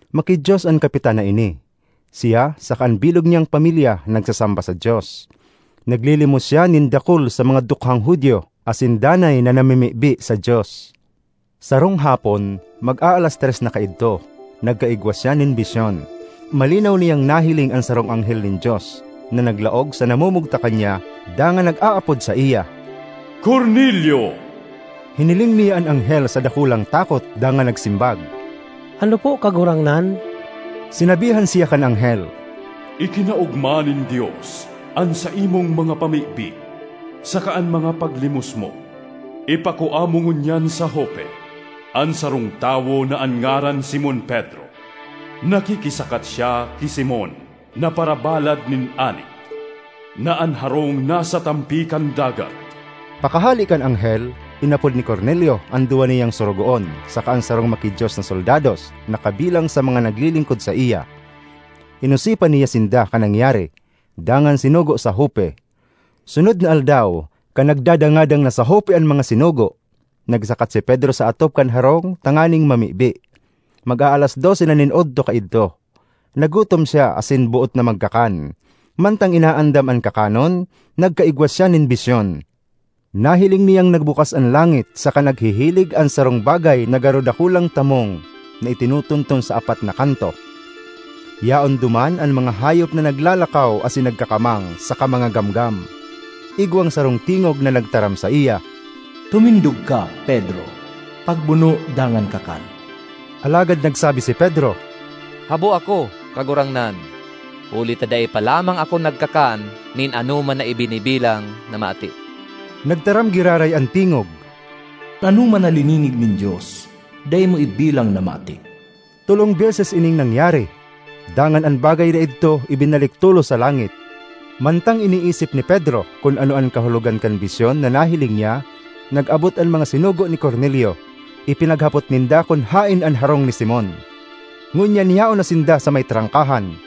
Maki-Dios an kapitan na ini. Siya saka an bilog niyang pamilya nagsasamba sa Dios. Naglilimos siya nin dakul sa mga dukhang Judio, asin danay na namimibi sa Dios. Sarong hapon, mag-aalas tres na kaidto, nagkaigwa siya nin bisyon: malinaw niyang nahiling an sarong anghel nin Dios na naglaog sa namumugtakan niya dangan nag-aapod saiya, “Cornelio!” Hiniling niya an anghel sa dakulang takot dangan nagsimbag, “Ano po Kagurangnan?” Sinabihan siya kan anghel, “Ikinaogma nin Dios an saimong mga pamibi saka an mga paglimos mo. Ipakua mo ngunyan sa Jope an sarong tawo na an ngaran Simon Pedro. Nakikisakat siya ki Simon na parabalad nin anit na an harong nasa tampi kan dagat.” Pakahale kan anghel, inapod ni Cornelio an duwa niyang sorogoon saka an sarong maki-Dios na soldados na kabilang sa mga naglilingkod saiya. Inosipan niya sinda kan nangyari, dangan sinugo sa Jope. Sunod na aldaw, kan nagdadangadang na sa Jope an mga sinugo, nagsakat si Pedro sa atop kan harong tanganing mamibi. Mag-aalas dose na nin odto kaidto. Nagutom siya asin boot na magkakan; mantang inaandam an kakanon, nagkaigwa siya nin bisyon. Nahiling niyang nagbukas an langit saka naghihilig an sarong bagay na garo dakulang tamong na itinutunton sa apat na kanto. Yaon duman an mga hayop na naglalakaw asin nagkakamang, saka mga gamgam. Igwang sarong tingog na nagtaram saiya, “Tumindog ka, Pedro; pagbuno dangan kakan!” Alagad nagsabi si Pedro, “Habo ako, Kagurangnan! Huli ta dai pa lamang ako nagkakan nin anoman na ibinibilang na maati.” Nagtaram giraray an tingog, “An anoman na lininig nin Dios, dai mo ibilang na maati.” Tolong beses ining nangyari; dangan an bagay na idto ibinalik tolos sa langit. Mantang iniisip ni Pedro kun ano an kahulogan kan bisyon na nahiling niya, nag-abot an mga sinugo ni Cornelio. Ipinaghapot ninda kun haen an harong ni Simon; ngunyan yaon na sinda sa may trangkahan.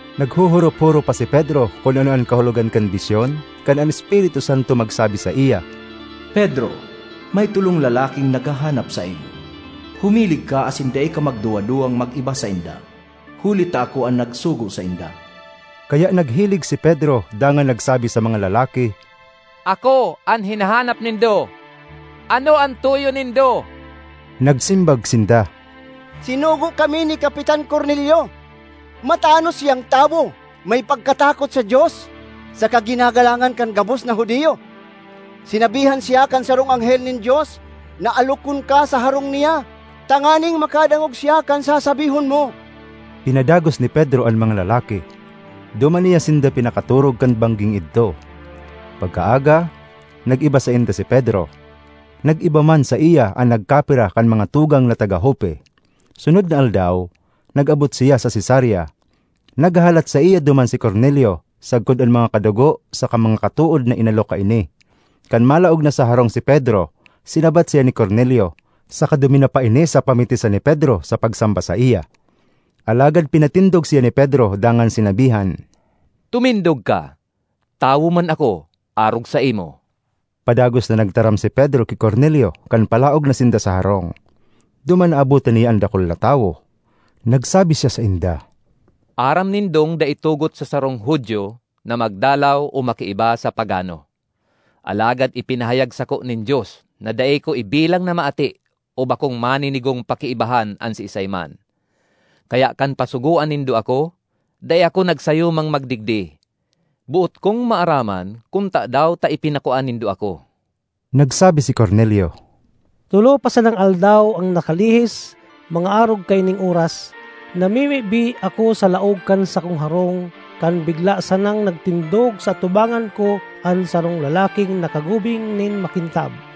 Naghohorop-horop pa si Pedro kun ano an kahulogan kan bisyon, kan an Espiritu Santo magsabi saiya, “Pedro, may tolong lalaking naghahanap saimo. Humilig ka asin dai ka magduwa-duwang mag-iba sainda, huli ta ako an nagsugo sainda.” Kaya naghilig si Pedro dangan nagsabi sa mga lalaki, “Ako an hinahanap nindo. Ano an tuyo nindo?” Nagsimbag sinda, “Sinugo kami ni Kapitan Cornelio. Matanos siyang tawo, may pagkatakot sa Dios, saka ginagalangan kan gabos na Judio. Sinabihan siya kan sarong anghel nin Dios na alokon ka sa harong niya, tanganing makadangog siya kan sasabihon mo.” Pinadagos ni Pedro an mga lalaki; duman niya sinda pinakatorog kan bangging idto. Pagkaaga, nag-iba sainda si Pedro; nag-iba man saiya an nagkapira kan mga tugang na taga Jope. Sunod na aldaw nag-abot siya sa Cesarea; naghahalat saiya duman si Cornelio sagkod an mga kadugo saka mga katood na inalok kaini. Kan malaog na sa harong si Pedro, sinabat siya ni Cornelio, saka duminapa ini sa pamitisan ni Pedro sa pagsamba saiya. Alagad pinatindog siya ni Pedro dangan sinabihan, “Tumindog ka; tawo man ako arog saimo.” Padagos na nagtaram si Pedro ki Cornelio kan palaog na sinda sa harong; duman naabotan niya an dakul na tawo. Nagsabi siya sainda, “Aram nindong dai tugot sa sarong Judio na magdalaw o makiiba sa pagano. Alagad ipinahayag sako nin Dios na dai ko ibilang na maati o bakong maninigong pakiibahan an siisay man. Kaya kan pasugoan nindo ako, dai ako nagsayumang magdigdi. Boot kong maaraman kun tadaw ta ipinakua nindo ako.” Nagsabi si Cornelio, “Tolo pa sanang aldaw an nakalihis, mga arog kaining oras, namimibi ako sa laog kan sakong harong kan bigla sanang nagtindog sa atubangan ko an sarong lalaking nakagubing nin makintab,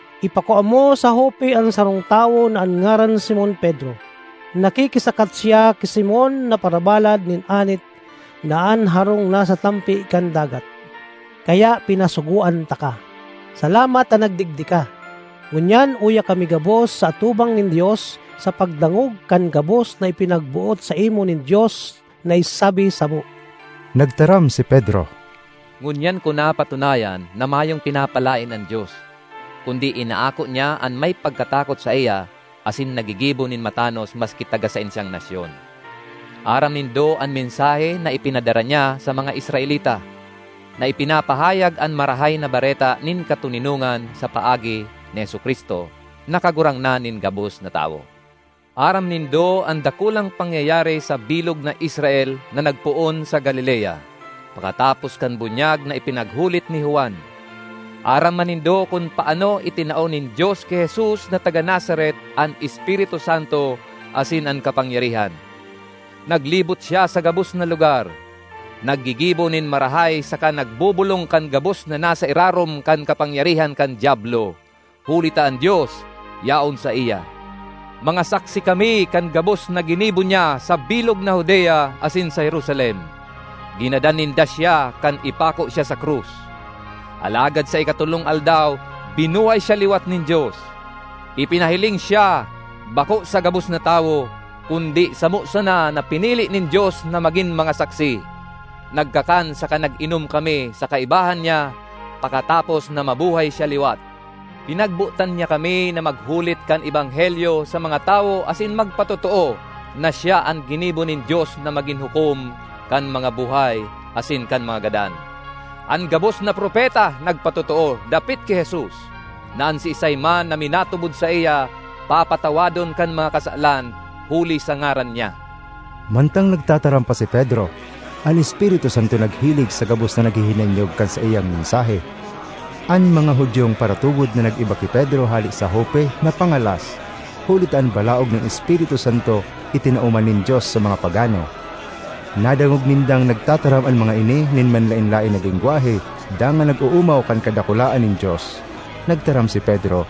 Ipakua mo sa Jope an sarong tawo na an ngaran Simon Pedro. Nakikisakat siya ki Simon na parabalad nin anit, na an harong nasa tampi kan dagat.’ Kaya pinasugoan taka. Salamat ta nagdigdi ka. Ngunyan uya kami gabos sa atubang nin Dios sa pagdangog kan gabos na ipinagboot saimo nin Dios na isabi samo.” Nagtaram si Pedro, “Ngunyan ko napatunayan na mayong pinapalaen an Dios, kundi inaako niya an may pagkatakot saiya asin naggigibo nin matanos maski taga saen siyang nasyon. Aram nindo an mensahe na ipinadara niya sa mga Israelita, na ipinapahayag an Marahay na Bareta nin katoninongan sa paagi ni Jesu-Cristo, na Kagurangnan nin gabos na tawo. Aram nindo an dakulang pangyayari sa bilog na Israel na nagpoon sa Galilea, pakatapos kan bunyag na ipinaghulit ni Juan. Aram man nindo kun paano itinao nin Dios ki Jesus na taga Nazaret an Espiritu Santo asin an kapangyarihan. Naglibot siya sa gabos na lugar, naggigibo nin marahay saka nagbobolong kan gabos na nasa irarom kan kapangyarihan kan Diablo, huli ta an Dios yaon saiya. Mga saksi kami kan gabos na ginibo niya sa bilog na Judea asin sa Jerusalem. Ginadan ninda siya kan ipako siya sa krus. Alagad sa ikatolong aldaw binuhay siya liwat nin Dios. Ipinahiling siya, bako sa gabos na tawo, kundi samo sana na pinili nin Dios na magin mga saksi. Nagkakan saka nag-inom kami sa kaibahan niya pakatapos na mabuhay siya liwat. Pinagbotan niya kami na maghulit kan ebanghelyo sa mga tawo asin magpatotoo na siya an ginibo nin Dios na magin hukom kan mga buhay asin kan mga gadan. An gabos na propeta nagpatotoo dapit ki Jesus, na an siisay man na minatubod saiya papatawadon kan mga kasalan huli sa ngaran niya.” Mantang nagtataram pa si Pedro, an Espiritu Santo naghilig sa gabos na naghihinanyog kan saiyang mensahe. An mga Judiong paratubod na nag-iba ki Pedro hale sa Jope napangalas, huli ta an balaog nin Espiritu Santo itinao man nin Dios sa mga pagano. Nadangog nindang nagtataram an mga ini nin manlaen-laen na lengwahe dangan nag-oomaw kan kadakulaan nin Dios. Nagtaram si Pedro,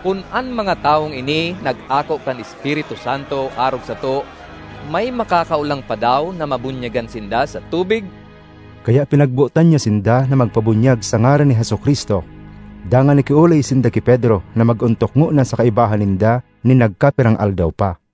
”Kun an mga tawong ini nag-ako kan Espiritu Santo arog sato, may makakaolang pa daw na mabunyagan sinda sa tubig?” Kaya pinagbotan niya sinda na magpabunyag sa ngaran ni Jesu-Cristo. Dangan nakiolay sinda ki Pedro na mag-ontok ngona sa kaibahan ninda nin nagkapirang aldaw pa.